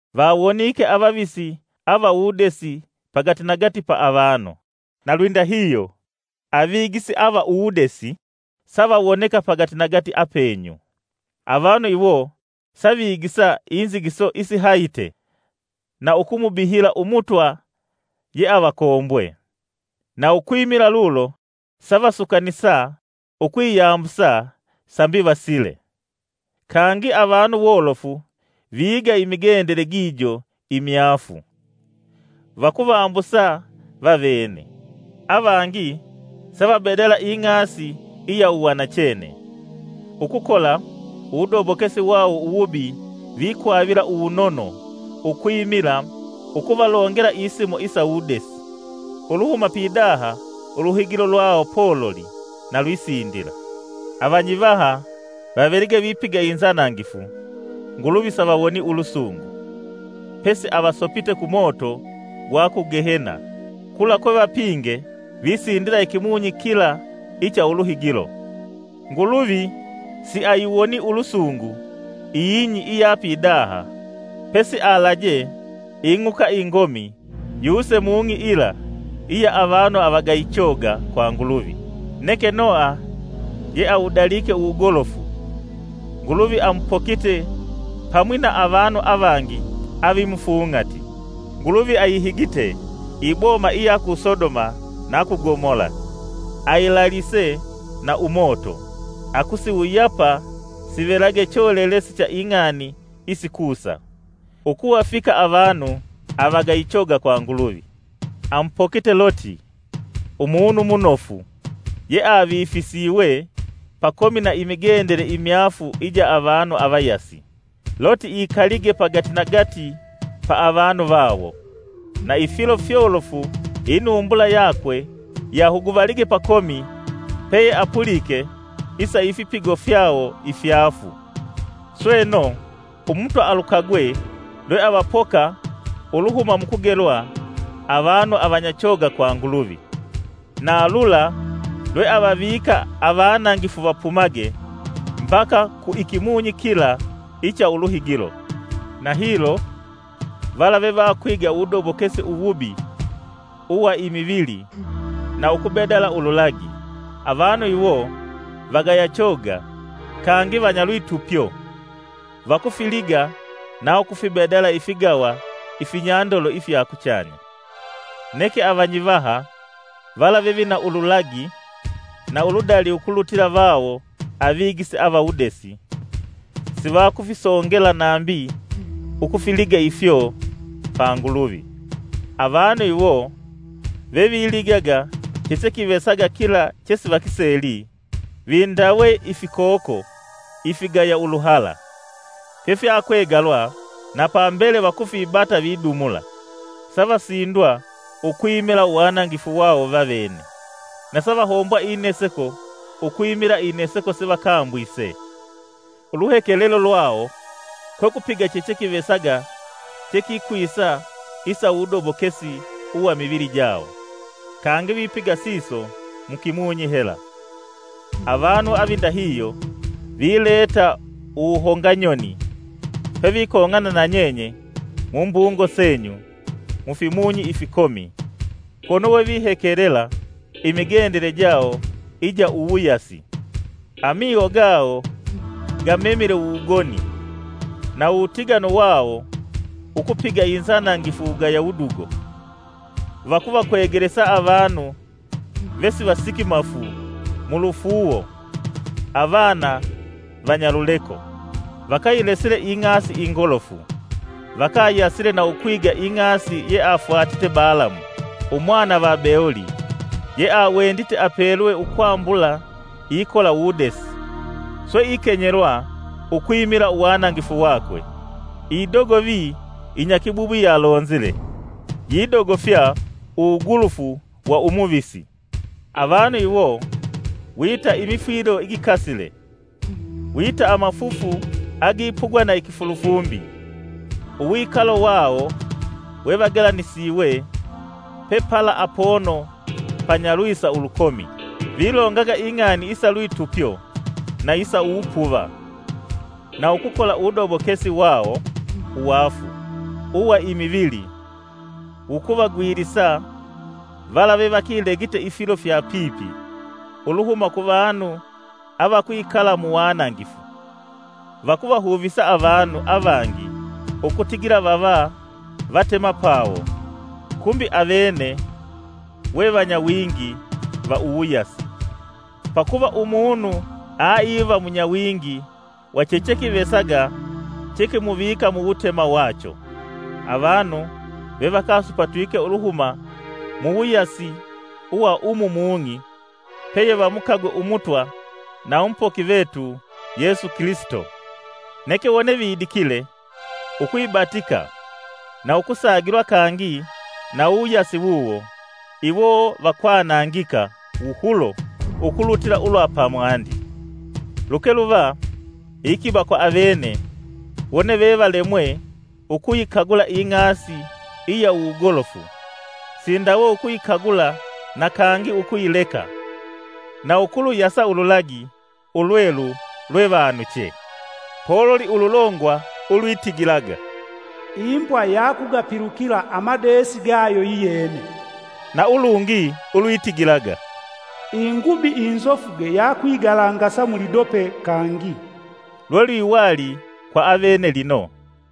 Vawonike avavisi ava uwudesi pagati nagati pa avanu, na lwindahihyo avigisi ava uwudesi savawoneka pagati nagati apenyu. Avanu iwo savigisa inzigiso isihahite na ukumubihila Umutwa yeavakombwe, na ukwimila lulo savasukanisa ukwiyambusa sambi vasile. Kangi avanu wolofu viiga imigendele gijo imyaafu, vakuvambusa vavene, avangi savabedala ing'asi iya uwanachene. Ukukola uwudobokesi wawo uwubi vakwavila uwunono ukwimila ukuvalongela isimo isa uwudesi, uluhuma pidaha uluhigilo lwawo pololi na lwisindila! Avanyivaha vavelige vipiga inzanangifu, Nguluvi savawonii ulusungu, pesi avasopite ku moto gwa ku Gehena kula kwevapinge visindila ikimunyi kila icha uluhigilo. Nguluvi siayiwonii ulusungu ing'i iya pidaha, pesi alaje ing'uka ingomi yuse mung'i yila iya avanu avagayi choga kwa Nguluvi; neke Noha ye awudalike uwugolofu, Nguluvi amupokite pamwi na avanu avangi avimufung'ati. Nguluvi ayihigite iboma iya ku Sodoma na ku Gomola, ayilalise na umoto, akusiwuyapa sivelage cholelesi cha ing'ani isikusa ukuvafika avanu agayi choga kwa Nguluvi. Amupokite Luti, umunu munofu, ye avifisiwe pakomi na imigendele imyaafu ija avanu avayasi. Luti ikalige pagatinagati pa avanu vawo, na ifilo fyolofu inumbula yakwe yahuguvalige pakomi peyeapulike isa ifipigo fyawo ifyaafu. Sweno, Umutwa alukagwe lwe avapoka uluhuma mukugelwa avanu avanyachoga kwa Nguluvi, na lula lweavavika avanangifu vapumage mbaka ku ikimunyi kila icha uluhigilo, na hilo vala vevakwiga uwudobokesi uwubi uwa imivili na ukubedala ululagi. Avanu iwo vagaya choga kangi vanyalwitupyo; vakufiliga na ukufibedala ifigawa ifinyandolo ifya kuchanya. Neke avanyivaha, vala vevina ululagi na uludali ukulutila vawo avigisi ava uwudesi, sivakufisongela nambi ukufiliga ifyo pa Nguluvi. Avanu iwo veviligaga chechekivesaga kila chesivakiseli, vindawe ifikoko ifigaya uluhala, fyefyakwegalwa na pambele vakufibata vidumula! Savasindwa ukwimila uwanangifu wawo vavene, na savahombwa ineseko ukwimila ineseko sevakambwise. Uluhekelelo lwawo kwekupiga chechekivesaga chekikwisa isa uwudobokesi uwa imivili jawo, kangi upigila siso mukimunyi hela. Avanu avindahihyo vileta uwuhonganyoni pevikong'ana na nyenye mumbungo senyu mufingi ifikomi, kono we uhekelela imigendele jawo ija uwuyasi. Amiho gawo gamemile uwugoni na uwutiganu wawo ukupiga inzanangifu wugaya wudugo. Vakuvakwegelesa avanu vesivasikimafu mulufuuwo, avana vanyaluleko. Vakayilesile ing'ani ingolofu, vakayasile na ukwiga ing'asi yeafwatite Balamu, umwana va Beoli, ye awendite apelwe ukwambula ikola uwudesi, swe ikenyelwa ukwimila uwanangifu wakwe. Idogovi inyakibubwi yalonzile, yidogofya uwugulufu wa umuvisi. Avanu iwo wita imifwilo igikasile, wita amafufu agipugwa na ikifulufumbi; uwikalo wawo wevagelanisiwe pepala apono panyalwisa ulukomi. Vilongaga ing'ani isalwitupyo na isa uwupuva, na ukukola uwudobokesi wawo uwaafu uwa imivili ukuvagwilisa vala vevakilegite ifilo fya pipi uluhuma kuvanu avakwikala muwanangifu. Vakuvahuvisa avanu avangi ukutigila vava vatemapawo, kumbi avene we vanyawingi va uwuyasi, pakuva umunu aiva munyawingi wa chechekivesaga chekimuvika muwutema wacho. Avanu vevakasupatwike uluhuma muwuyasi wa umu mung'i peyevamukagwe Umutwa na Umupoki vetu Yesu Kilisito, neke wone vidikile ukwibatika na ukusagilwa kangi na uwuyasi wuwo, iwo vakwanangika wuhulo ukulutila ulwa pamwandi. Luke luva iikiba kwa avene wone vevalemwe ukuyikagula ing'asi iya uwugolofu sindawe ukuyikagula na kangi ukuyileka na ukuluyasa ululagi ulwelu lwevanuchee. Poluli ululongwa ulwitigilaga! “Imbwa ya yakugapilukila amadeesi gayo yiyene.” na ulungi ulwitigilaga: “Ingubi inzofuge yakwigalangasa mulidope kangi!” lwelwiwali kw avene lino.